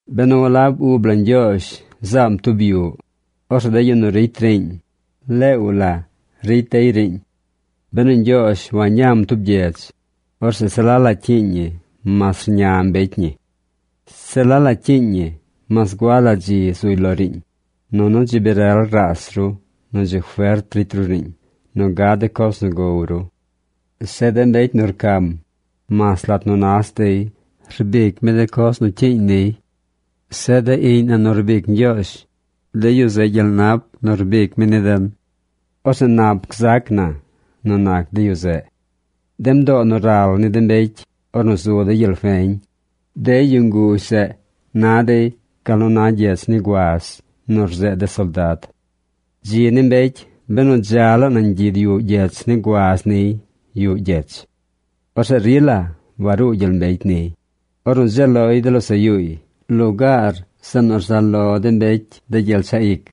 Benu walab ub la Ñgyoozh zaam tub yuꞌ, orzeꞌ de yu nu ricy riiñ leew la ricy dey riiñ. Benu Ñgyoozh wañam tub gyedz, orzeꞌ se la la cyiiñ ñi mas rña mbecy ñi. Se la la cyiiñ ñi mas gua la dzi zuy lo riiñ, nunu dzi bi rel raas ru nu dzi fert ricy ru riiñ nu gad de coz nu gow ru. Zeꞌ de mbecy nu rcam, mas lat nu nas dey rbic mi de coz nu cyiiñ niy. Zeꞌ de iꞌñ na nu rbic Ñgyoozh, de yu zeꞌ gyel nap nu rbic mi ni den. Orzeꞌ nap gzac na nu nac de yu zeꞌ. De mdoo nu ral ni de mbecy ornu zu dey gyel feñ, de yu nguzh zeꞌ na dey gal nu na gyech ni guaz nu rzeed de soldad. Dzi ni mbecy benu dza laa nañ gyid yuꞌ gyech ni guaz niy yuꞌ gyech. Orzeꞌ rila waruu gyel mbecy niy, ornu dzeel loy de losaꞌ yuuy lugaar zeꞌ nu rzaꞌ lo de mbecy de gyel chaꞌ ic.